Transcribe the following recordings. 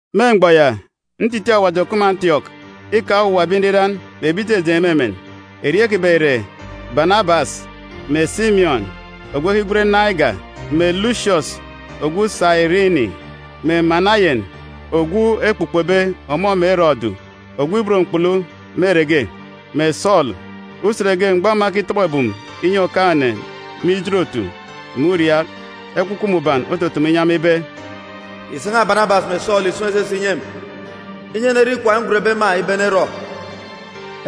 Me mgbọ ya, ntitiin̄ Awaji òkup me Antiọk îkaan̄ owuwa ebi nriran mè ebi ijejeen̄ me emen. Erieen̄ kiban̄ ìre Banabas mè Simiọn ogwu ekigwen Nigeri, mè Lusiọs ogwu Sairini mè Manayen, (Ogwu ekpukpobe ọmọ mè Erọdu ogwu ibot mkpulu me ere ge), mè Sọọlu. Usen ge mgbọ ema ekitọbọ ebum inyi Okaan̄-ene me ijin-otu mè uriaak, Ekwukwu Mbuban otutumu inyi ema ibe, “Ìsan̄a Banabas mè Sọọlu ìsun̄ esese ìnyi emi, inyi enerọ ikwaan̄ ngwenbe ema ibe enerọ!”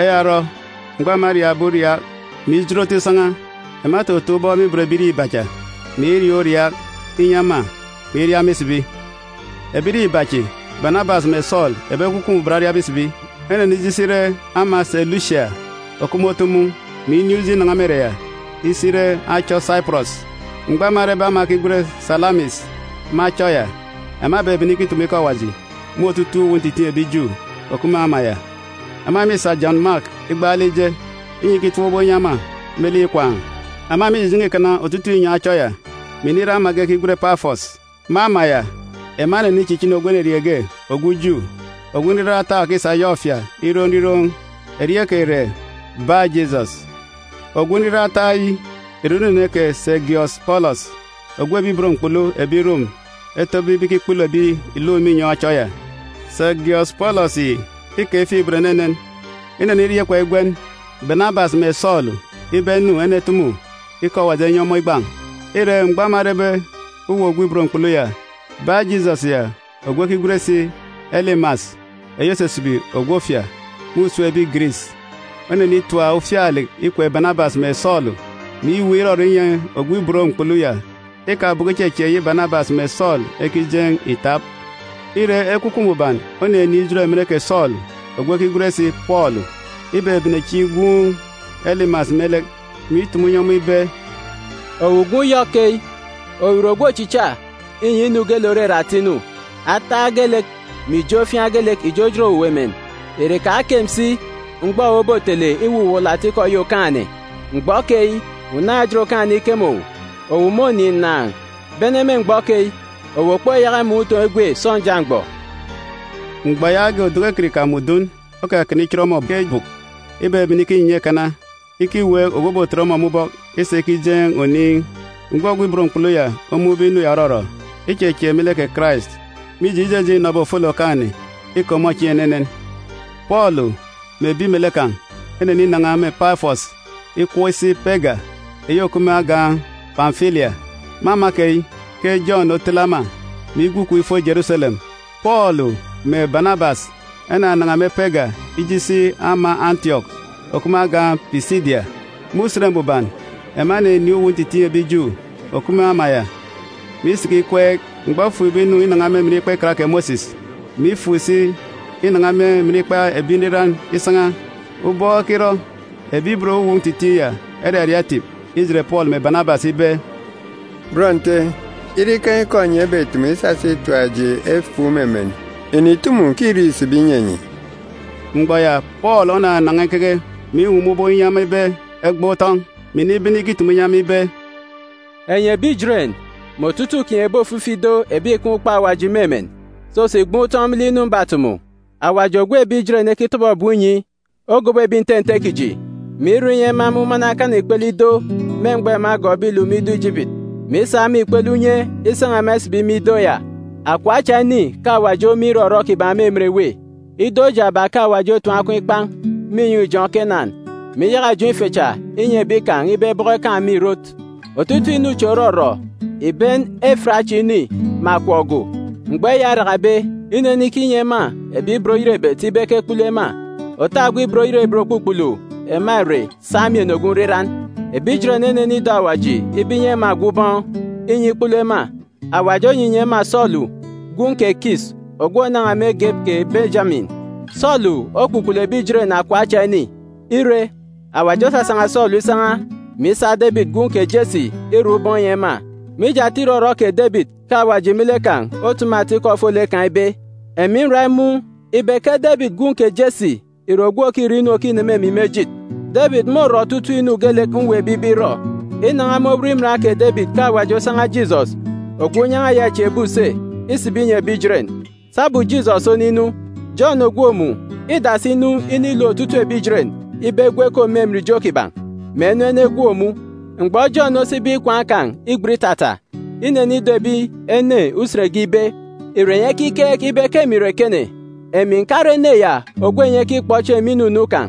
Eya orọ, mgbọ ema eriaakbe uriaak, mè ijin otu isan̄a, ema etotoon̄ ubọk me ibot ebirieen̄ iba cha, mè iriaak uriaak inyi ema, mè iria ema isibi. Ebirieen̄ iba chi, Banabas mè Sọọlu, ebi Ekwukwu Mbuban oriabe isibi, enenije isi ire ama Selusia òkup me otu mun̄, mè inin̄ uji inan̄a me ere ya isi ire achọ Saipọrọs. Mgbọ ema erebe ama ekigwen Salamis me achọ ya, ema ebebene ikitumu ikọ Awaji me otutuuk uwu ntitiin̄ ebi Ju òkup me ama ya. Ema mîsa Jọn Mak igbaalek ije, inyi ikitap ubọk inyi ema me lek ikwaan̄. Ema mîjijen̄e ikana otutuuk inyọn̄ achọ ya, mè inire ama ge ekigwen Pafọs. Me ama ya, ema enenichichini ogwu enerieen̄ ge ogwu Ju, ogwu nriran ataak, òkisa yọk ofia iroon̄ nriroon̄. Erieen̄ kan̄ ìre Baa-Jisọs. Ogwu nriran ataak yi ìre unene kè Segiọs Pọlọs, ogwu ebi ibot mkpulu ebi Rom etobe ibe ikikpulu ebi ìluk me inyọn̄ achọ ya. Segiọs Pọlọs yi îkaan̄ ifuk-ibot enenen. Ineniria ikwaan̄ igwen Banabas mè Sọọlu ibe enu enetumu ikọ Awaji enyi ọmọ igban̄. Ire, mgbọ ema erebe uwu ogwu ibot mkpulu ya, Baa-Jisọs ya, ogwu ekigwen si Elimas (eyi òsisibi “ogwu ofia” me usem ebi Giris), onenitap ufialek ikwek Banabas mè Sọọlu, mè iweek irọrọ inyi ogwu ibot mkpulu ya ikabọkọ ichechieek eyi Banabas mè Sọọlu ekijeen̄ ìtap. Ire, Ekwukwu Mbuban oninin̄ ijot emen kè Sọọlu ogwu ekigwen si Pọọlu. Ibebene chieen̄ igwuun̄ Elimas me lek, mè itumu inyi ọmọ ibe, “Owu gwun̄ yọk keyi! Owu ìre ogwu ochicha inyi inu geelek òrere ata inu. Ataak geelek mè ijo ofiaan̄ geelek ìjojot owu emen. Ìre ìkakem si mgbọ owu obotele iwuwuwọlọ atikọ eyi Okaan̄-ene? Mgbọ keyi, unaan̄-ejit Okaan̄-ene îkeme owu. Owu mônin̄ ǹnàan̄. Bene me mgbọ keyi, owu òkpoyaka imọọn̄ utoon̄ egwe sọnja mgbọ.” Mgbọ yaage, oduku ekirika mè udun okakana ichit ọmọ ke bùk. Ibebene ikinyinya ikana ikiweek ogwu òbotet ọmọ me ubọk isa ikijeen̄ oniin̄. Mgbọ ogwu ibot mkpulu ya omun̄be inu ya òrọrọ, ichechieek me lek kè Karais, mije, ijejeen̄ înọbe ofolek Okaan̄-ene îke ọmọ chieen̄ enenen. Pọọlu mè ebi melek kan̄ eneninan̄a me Pafọs ikọp isi Pega eyi òkup me agan̄ Pamfilia. Me ama keyi ke Jọn otele ema, mè igwu ikom ifo Jeruselem. Pọọlu mè Banabas enanan̄a me Pega ije isi ama Antiọk òkup me agan̄ Pisidia. Me Usen Mbuban, ema eninin̄ uwu ntitiin̄ ebi Ju òkup me ama ya, mè isiki ikweek. Mgbọ efukbe inu inan̄a me emen Ikpa Ikan kè Mosis, mè ifuk si inan̄a me emen ikpa ebi nriran isan̄a, ubọk ekirọ, ebi ibot uwu ntitiin̄ ya eraria etip ijet Pọọlu mè Banabas ibe, “Bọn Nte, ire ikaan̄ ikọ enyi ebetumu isasa itap eji efuuk me emen, ìnitumu, ke irek îsibi inyi enyi.” Mgbọ ya, Pọọlu onanan̄a ikeke, mè iwuwum ubọk inyi ema ibe egban̄ utọn̄, mè inibene ikitumu inyi ema ibe, “Enyi ebi Ijeren, mè otutuuk kinyi ebi ofifi ido ebi ìkaan̄ ukpook Awaji me emen, soso ìgban̄ utọn̄ me lek inu mbatumu! Awaji ogwu ebi Ijeren ekitọbọ ebum inyi ogobo ebi nte nte kiji, mè irọ inyi ema emumana ekana ikpele ido me mgbọ ema egọọkbe iluk me ido Ijipiti, mè isa me ikpele unye isan̄a ema isibi me ido ya. Akọp acha ini ke Awaji ome irọrọ kiban̄ me emen èwê. Ido jaaba ke Awaji otim akọn̄ ikpan̄ me inyọn̄ ijọn̄ Kenan, mè iyaka ijọn̄ ife cha inyi ebi kan̄ ibe ebọkọ esak me ìrot. Otutuuk inu chi òrọrọ ìben efit acha ini mè akọp go. “Mgbọ eya orakabe, inenikinyi ema ebi ibot oyerebet ibe ekekpulu ema. Òta ogwu ibot oyerebet òkpukpulu ema ìre Samien ogwu nriran. Ebi Ijeren enenido Awaji ibe inyi ema ogwu ubọọn̄, inyi ikikpulu ema. Awaji onyinyi ema Sọọlu gwun̄ kè Kis ogwu ònan̄a me egep kè Benjamin. Sọọlu okpukpulu ebi Ijeren akọp acha ini. Ire, Awaji osasan̄a Sọọlu isan̄a, mè isa Debit gwun̄ kè Jesi irọ ubọọn̄ inyi ema. Mije ata irọrọ kè Debit ke Awaji me lek kan̄ otumu ata ikọ ofolek kan̄ ibe, ‘Emi nra imun̄ ibe ke Debit gwun̄ kè Jesi ìre ogwu òkirọ inu òkineme emi me ejit. Debit môrọ otutuuk inu geelek mweekbe ibe irọ.’ Inan̄a me owot iman kè Debit ke Awaji osan̄a Jisọs, ogwu unyan̄a ya îchieekbe use, isibi inyi ebi Ijeren. Sabum Jisọs oninu, Jọn ògwook mun̄ îdasi inu inilook otutuuk ebi Ijeren ibe egwu ekom me emen ijo kiban̄, mè enu enegwook mun̄. Mgbọ Jọn osibe ikwaan̄ kan̄ igbet itata, inenido ebi ene usen ge ibe, ‘Ìre enyi ekikeek ibe ke emi ìre ekene? Emi ǹkare ene ya ogwu enyi ekikpọ chieen̄ me inunu kan̄.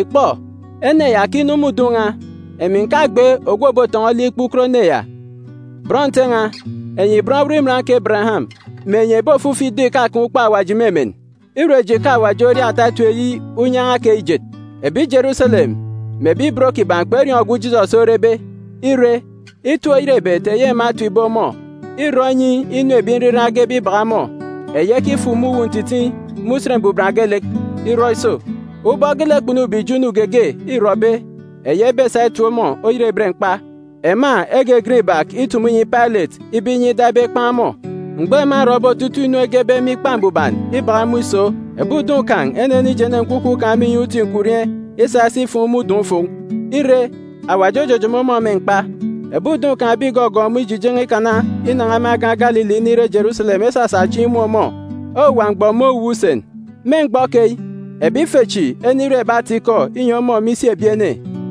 Ìkpọ, ene ya òkinu me udun̄ n̄a, emi ǹkagbe ogwu òbotọn̄ọ olik ikpukot ene ya.’ “Bọn Nte n̄a, enyi bọn owot iman kè Ebereyam, mè enyi ebi ofifi ido ìkakaan̄ ukpook Awaji me emen, îre eji ke Awaji oria ata etip eyi unyan̄a keyi ijet. Ebi Jeruselem mè ebi ibot kiban̄ kperiọọn̄ ogwu Jisọs orebe. Ire, itip-oyerebet eyi ema etipbe ọmọ îrọ inyi inu ebi nriran egebe ibak ọmọ, eyi ekifuk me uwu ntitiin̄ me Usen Mbuban geelek, irọ iso. Ubọk geelek kpunube ijo inu geege îrọbe eyi ebesa itip ọmọ oyerebet mkpa, ema egegen ibak itumu inyi Pailet ibe inyi ida ibe ekpan̄ ọmọ. Mgbọ ema erọbe otutuuk inu egebe me Ikpa Mbuban ibak ọmọ iso, ebi udun̄ kan̄ enenijene nkwukwu kan̄ me inyọn̄ uti nkwurieen̄ isa isi ifuun̄ me udọn̄-ufuun̄. Ire, Awaji ojojomo ọmọ me mkpa. Ebi udun̄ kan̄ ebi ìgọgọọk ọmọ ijijen̄e ikana inan̄a me agan̄ Galili inire Jeruselem esasa chieen̄ imun̄ ọmọ owuwa mgbọ me owuwa usen. Me mgbọ keyi, ebi ife chi enire ebi ata-ikọ inyi ọmọ me isi ebi ene.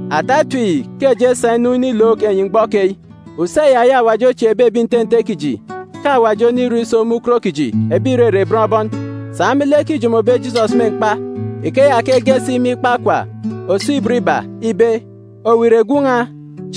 “Ata etip yi ke eji esa inu inilook enyi mgbọ keyi: Use ya eyi Awaji ochieekbe ebi nte nte kiji ke Awaji onirọ iso me ukot kiji ebi ìrere bọn bọn, sa me lek îjomobe Jisọs me mkpa. Ikeya ke ege si me ikpa Okwa, òso ibot iba, ibe, “ ‘Owu ìre Gwun̄ n̄a,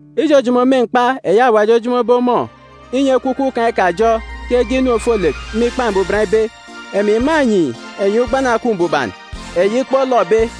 Ijojomo me mkpa eyi Awaji ojomobe ọmọ inyi nkwukwu kan̄ ikajọ ke ege inu ofolek me Ikpa Mbuban ibe, “ ‘Emi mânyi enyi ugbana òkup mbuban, eyi kpolọbe,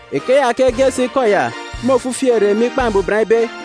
Ikeya ke ege si ikọ ya me ofifi ere me Ikpa Mbuban ibe,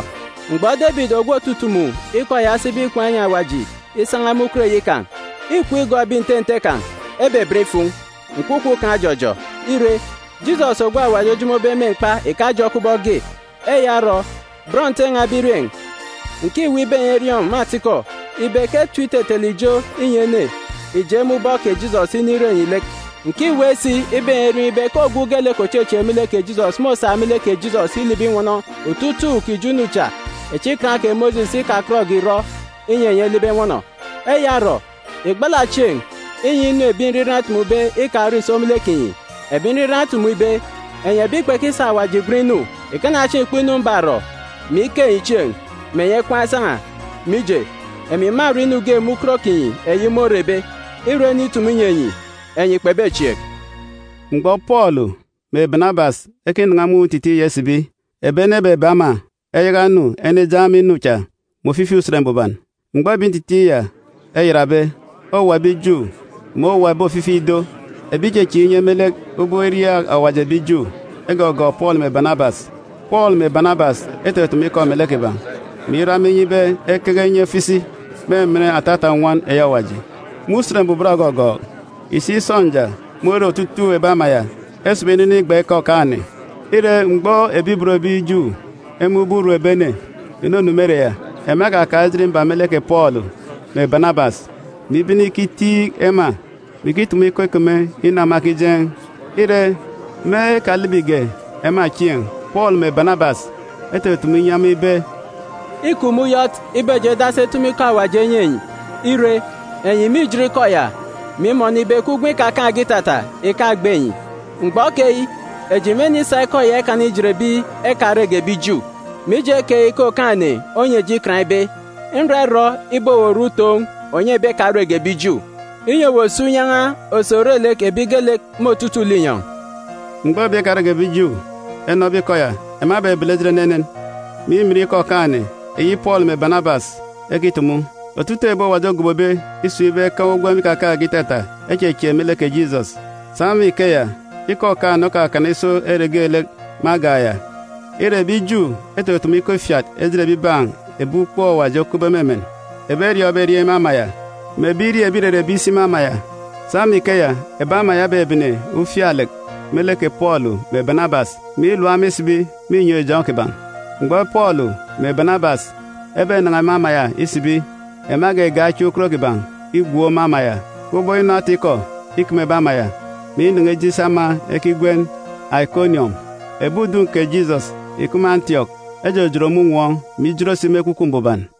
“Mgbọ Debit ogwu òtutumu ikọ ya osibe ikwaan̄ inyi Awaji isan̄a me ukot eyi kan̄, îkwu igọọk ebi nte nte kan̄, ebeben ifuun̄, nkwukwu kan̄ ojọjọ. Ire, Jisọs ogwu Awaji ojomobe me mkpa ìkajọ kubọk ge. Eya orọ, bọn Nte n̄a ebirieen̄, ǹkiweek ibe enyi eriọọn̄ me atikọ ibe ke etip itetele ijo inyi ene ìje me ubọk kè Jisọs inire enyi lek. Ǹkiweek si ibe enyi eriọọn̄ ibe ke ogwu geelek òchechieek me lek kè Jisọs môsa me lek kè Jisọs ilibi inwọnọ otutuuk ijo inu cha echi Ikan kè Mosis ikakọtge ìrọ inyi enyi elibi enwọnọ. “Eya orọ, ìgbala chieen̄, inyi inu ebi nriran etumube ikarọ ìso me lek kinyi. Ebi nriran etumu ibe, “ ‘Enyi ebi kpekisa Awaji igwen inu, ìkana chieen̄ ìkpọ inu mbarọ, mè ike enyi chieen̄, mè enyi ekwaan̄ esan̄a. Mije, emi mârọ inu ge me ukot kinyi eyi môrebe, ire ene itumu inyi enyi, enyi kpebechieek.’d” Mgbọ Pọọlu mè Banabas ekinan̄a me uwu ntitiin̄ ya isibi, ebi ene ebebe ema eyaka enu enejeen̄ ema inu cha me ofifi Usen Mbuban. Mgbọ ebi ntitiin̄ ya eyatbe, owuwa ebi Ju mè owuwa ebi ofifi ido ebi ìchechieek inye me lek ubọk iriaak Awaji ebi Ju egọgọọk Pọọlu mè Banabas. Pọọlu mè Banabas etutumu ikọ melek kiban̄, mè irọ ema inye ibe ekeke enye efo isi me emen atata nnwọn eyi Awaji. Me Usen Mbuban ògọgọọk, ìsik sọnja more otutuuk ebi ama ya esibi inu inigban ikọ Okaan̄-ene. Ire, mgbọ ebi ibot ebi Ju emun̄be urum ebi ene ìnunu me ere ya, ema ekakaan̄ ejit mba me lek kè Pọọlu mè Banabas, mè ibene ikitiik ema, mè ikitumu ikọ ikeme inu ema ekijeen̄. Ire, me ekalibige ema chieen̄, Pọọlu mè Banabas etutumu inyi ema ibe, “Îkup me uyọt ibe eji edasi etumu ikọ Awaji enyi enyi. Ire, enyi mîjit ikọ ya, mè imọnọ ibe ke ugwem ikakaan̄ge itata ìkagbe enyi. Mgbọ keyi, eji mênisa ikọ ya ikana ijet ebi ekarege ebi Ju. Mije keyi ke Okaan̄-ene onyi eji ikan ibe, “ ‘Nra irọ ibe owu òre utoon̄ ònyi ebi ekarege ebi Ju, inyi owu òsa unyan̄a òsi òre lek ebi geelek me otutuuk linyọn̄.’e” Mgbọ ebi ekarege ebi Ju enọbe ikọ ya, ema ebebele ejit enenen, mè imin ikọ Okaan̄-ene eyi Pọọlu mè Banabas ekitumu. Otutuuk ebi Awaji ogobobe isun̄ ibe ekaan̄ ugwem ikakaan̄ge itata echechieek me lek kè Jisọs. Sa me ikeya, ikọ Okaan̄-ene okakana iso ere geelek me agan̄ ya. Ire, ebi Ju etutumu ikọ ifiat ejit ebibaan̄ ebi ukpook Awaji okupbe me emen, ebi eriọọn̄be erieen̄ me ama ya, mè ebirieen̄ ebi ìrere ebi isi me ama ya. Sa me ikeya, ebi ama ya ebebene ufialek me lek kè Pọọlu mè Banabas, mè ilap ema isibi me inyọn̄ ijọn̄ kiban̄. Mgbọ Pọọlu mè Banabas ebenan̄a me ama ya isibi, ema egegen̄ achiaan̄ ukot kiban̄ igwook me ama ya kubọk inu ata-ikọ ikeme ebi ama ya, mè inan̄a ije isi ama ekigwen Aikoniọm. Ebi udun̄ kè Jisọs ìkup me Antiọk ejojot me unwọọn̄, mè ijot si me Ekwukwu Mbuban.